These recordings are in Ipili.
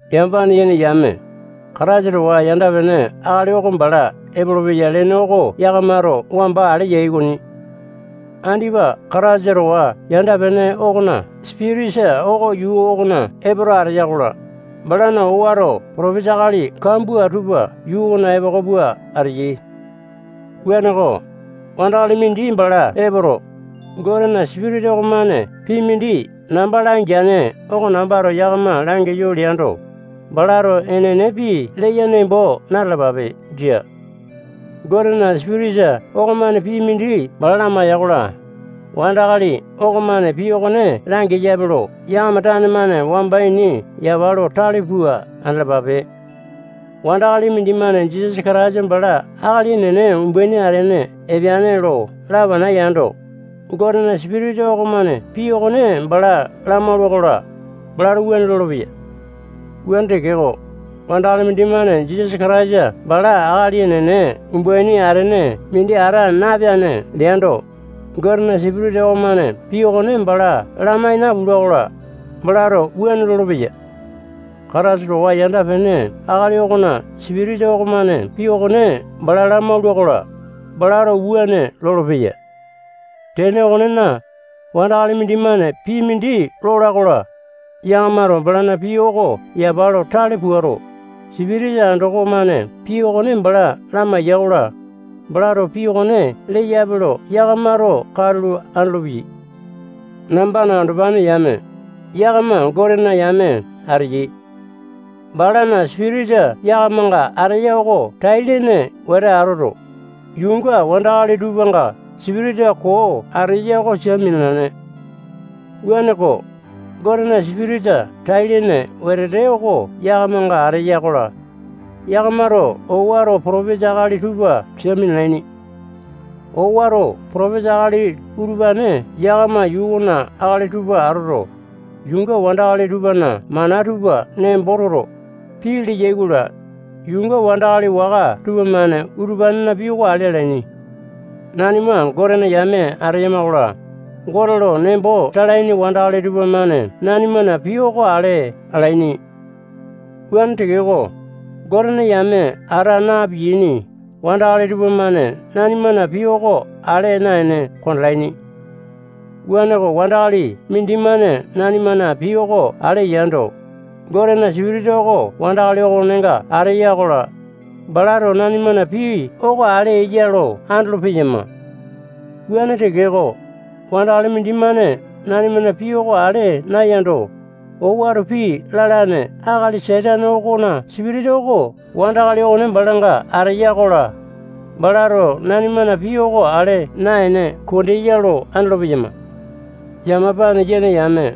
Yamapane yene yame, Kataisa towa yanda-pene akali oko bala epolopeya lene oko yakamato wamba ale yai okoni. Andipa Kataisa towa yanda-pene okona sipitisa oko yuu okona epoto ateya-kola, balana owato potopesa akali kambua tupa yuu okona epoko pua ateyai. Wuaneko, wandakali mindi bala epoto, Gotena Sipitisa okomane pii mindi namba langeane oko nambato yakama langeyo leando, balato enene pii leya nembo na-talapape. Jia. Gotena Sipitisa okomane pii mindi bala lamaiya-kola, wandakali okomane pii okone langeyape lo yakama tane-mane wamba ini yapa lo tale pua andalapape. Wandakali mindimane Jisasa Kataisa bala akali enene umbaini atene epeane lo lapana yando, Gotena Sipitisa okomane pii okone bala lamaula-kola, balato wuane lolopeya. Wuane tekeko, wandakali mindimane Jisasa Kataisa bala akali enene umbaini atene mindi ata napeane leando, Gotena Sipitisa okomane pii okone bala lamai napula-kola, balato wuane lolopeya. Kataisa towa yanda-pene akali okona sipitisa okomane pii okone bala lamaula-kola, balato wuane lolopeya. Tene okonena, wandakali mindimane pii mindi lola-kola, yakamato balana pii oko yapa lo tale puato, sipitisa andoko-mane pii okone bala lamaiya-kola, balato pii okone leyape lo yakamato katulo andolopeyai. Nambana andopane yame, yakama Gotena yame ateyai. Balana Sipitisa yakamanga ateya oko tai-lene wete atoto, yuunga wandakali tupanga sipitisa koo ateya oko sia minalane. Wuaneko, Gotena Sipitisa tai-lene wetete oko yakamanga ateya-kola, yakamato owato potopesa akali tupa sia minalaini. Owato potopesa akali utupane yakama yuu okona akali tupa atoto, yuunga wandakali tupana mana tupa nembo toto, pii leyai-kola, yuunga wandakali waka tupamane utupanena pii oko ale alaini. Nanima Gotena yame ateyama-kola, Gote lo nembo talaini wandakali tupamane nanimana pii oko ale alaini. Wuane tekeko, Gotena yame ata na-piyaini wandakali tupamane nanimana pii oko ale naene kondalaini. Wuaneko, wandakali mindimane nanimana pii oko ale yando, Gotena Sipitisa oko wandakali okonenga ateya-kola, balato nanimana pii oko ale eya lo andolo-peyama. Wuane tekeko, wandakali mindimane nanimana pii oko ale nayando, owato pii lalane akali Satane okona sipitisa oko wandakali okone balanga ateya-kola, balato nanimana pii oko ale naene kondeya lo andolo-peyama. Yamapane yene yame,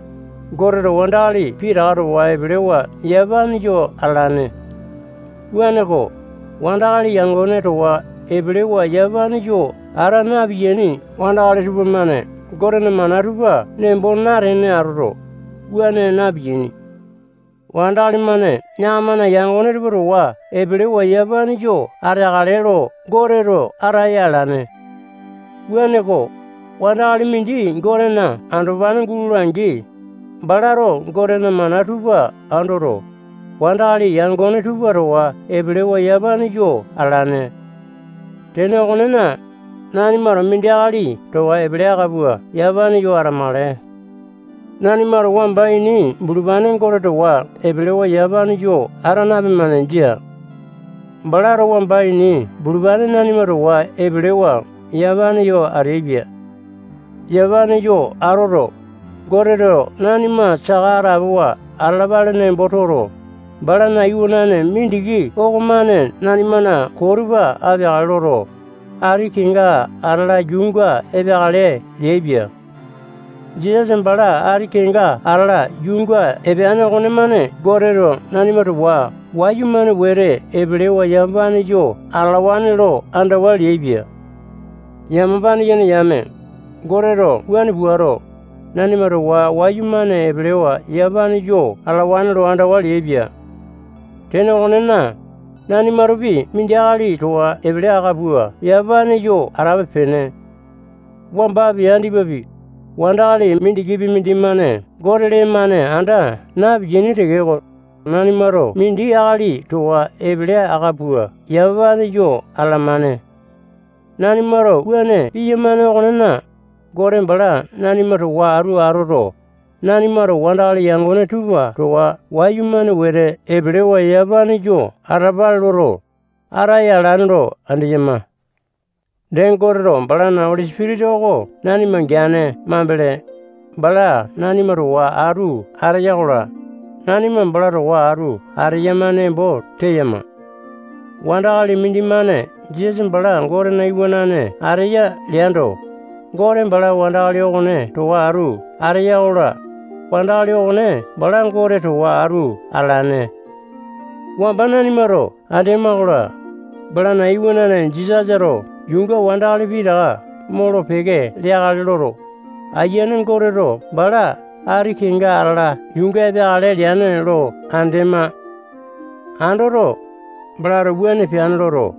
Goteto wandakali pitaka towa epelewa yamapane yo atalane. Wuaneko, wandakali yangone towa epelewa yamapane yo ata na-piyaini wandakali tupamane Gotena mana tupa nembo natene atoto, wuane na-piyaini. Wandakali-mane yakamana yangone tupa towa epelewa yamapane yo ateakale lo Goteto ataya alane. Wuaneko, wandakali mindi Gotena andopane gulola-angi, balato Gotena mana tupa andoto, wandakali yangone tupa towa epelewa yamapane yo atalane. Tene okonena, nanimato mindi akali towa epele aka pua yamapane yo atamakale. Nanimato wamba ini bulupane Gote towa epelewa yamapane yo ata napemane. Jia. Balato wamba ini bulupane nanima towa epelewa yamapane yo ateaipia. Yamapane yo atoto, Goteto nanima saka atapowa atalapale nembo toto, balana iwanane mindiki okomane nanimana koo tupa apeakale loto, ati kenga atala yuunga epeakale leaipia. Jisasa bala ati kenga atala yuunga epeane okonemane Goteto nanima towa wayumane wete epelewa yamapane yo atalawane lo andawa leaipia. Yamapane yene yame, Goteto wuane puato, nanima towa wayumane epelewa yamapane yo atalawane lo andawa leaipia. Tene okonena, nanimatopi mindi akali towa epele aka pua yamapane yo atape-pene. Wambapi, andipapi, wandakali mindikipi mindimane Gote lee-mane anda napiyane tekeko, nanimato mindi akali towa epele aka pua yamapane yo atalamane. Nanimato wuane piyamane okonena, Gote bala nanima towa atu atoto, nanimato wandakali yangone tupa towa wayumane wete epelewa yamapane yo atalapale loto, ataya alane lo andeyama. Dee, Goteto balana Oli Sipitisa oko nanima geane mambele, bala nanima towa atu ateya-kola, nanima bala towa atu ateyama nembo teyama. Wandakali mindimane Jisasa bala Gotena Iwanane ateya leando, Gote bala wandakali okone towa atu ateya-kola, wandakali okone bala Gote towa atu atalane. Wamba nanimato andema-kola, balana iwanane Jisasato yuunga wandakali pitaka molo-peke leakale loto, Ayiane Goteto bala ati kenga atala yuunga epeakale leane lo andema. Andoto, balato wuane peane loto,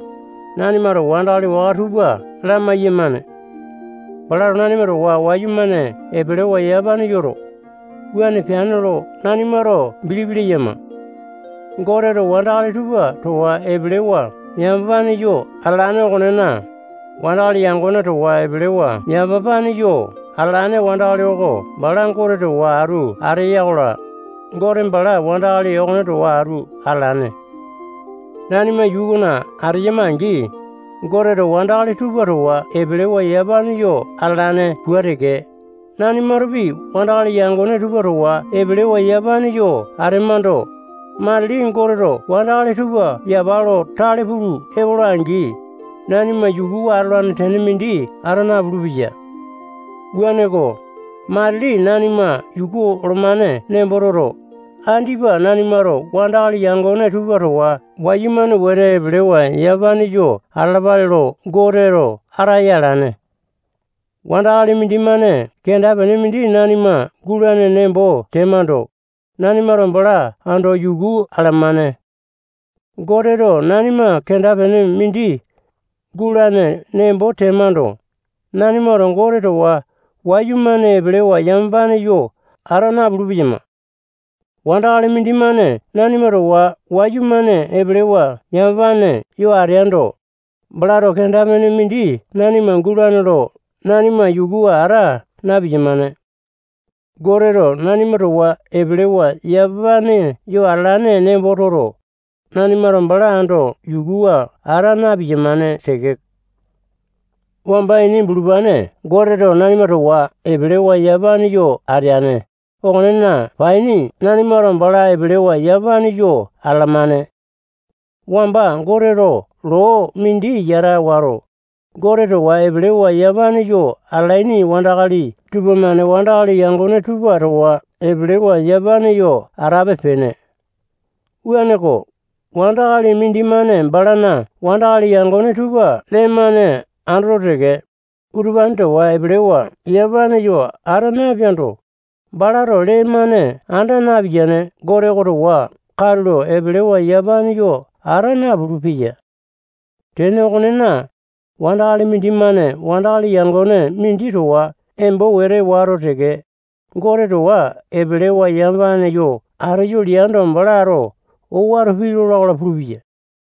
nanimato wandakali waka tupa lamai-yamane. Balato nanima towa wayumane epelewa yamapane yoto, wuane peane lo nanimato bilipi leyama. Goteto wandakali tupa towa epelewa yamapane yo atalane okonena, wandakali yangone towa epelewa yamapane yo atalane wandakali oko bala Gote towa atu ateya-kola, Gote bala wandakali okone towa atu atalane. Nanima yuu okona ateyama-angi, Goteto wandakali tupa towa epelewa yamapane yo atalane pua teke, nanimatopi wandakali yangone tupa towa epelewa yamapane yo atemando, matili Goteto wandakali tupa yapa lo tale pulu epola-angi, nanima yukuwa atolane tene mindi ata napulu-peya. Wuaneko, matili nanima yuku olomane nembo toto, andipa nanimato wandakali yangone tupa towa wayumane wete epelewa yamapane yo atalapale lo Goteto ataya alane. Wandakali mindimane kenda-pene mindi nanima gulane nembo temando, nanimato bala ando yuku alamane. Goteto nanima kenda-pene mindi gulane nembo temando, nanimato Gote towa wayumane epelewa yamapane yo ata napulu-peyama. Wandakali mindimane nanima towa wayumane epelewa yamapane yo ateando, balato kenda-pene mindi nanima gulane lo nanima yukuwa ata na-piyamane. Goteto nanima towa epelewa yamapane yo atalane nembo toto, nanimato bala ando yukuwa ata na-piyamane teke. Wamba ini bulupane Goteto nanima towa epelewa yamapane yo ateane okonena paini nanimato bala epelewa yamapane yo atalamane. Wamba Goteto loo mindi yata wato, Gote towa epelewa yamapane yo atalaini wandakali tupamane wandakali yangone tupa towa epelewa yamapane yo atape-pene. Wuaneko, wandakali mindimane balana wandakali yangone tupa lee-mane andoto teke, utupane towa epelewa yamapane yo ata napeando, balato lee-mane anda napiyane Gote oko towa katulo epelewa yamapane yo ata napulu-peya. Tene okonena, wandakali mindimane wandakali yangone mindi towa embo wete wato teke, Gote towa epelewa yamapane yo ateyo leando, balato owato pii lola-kola pulupeya.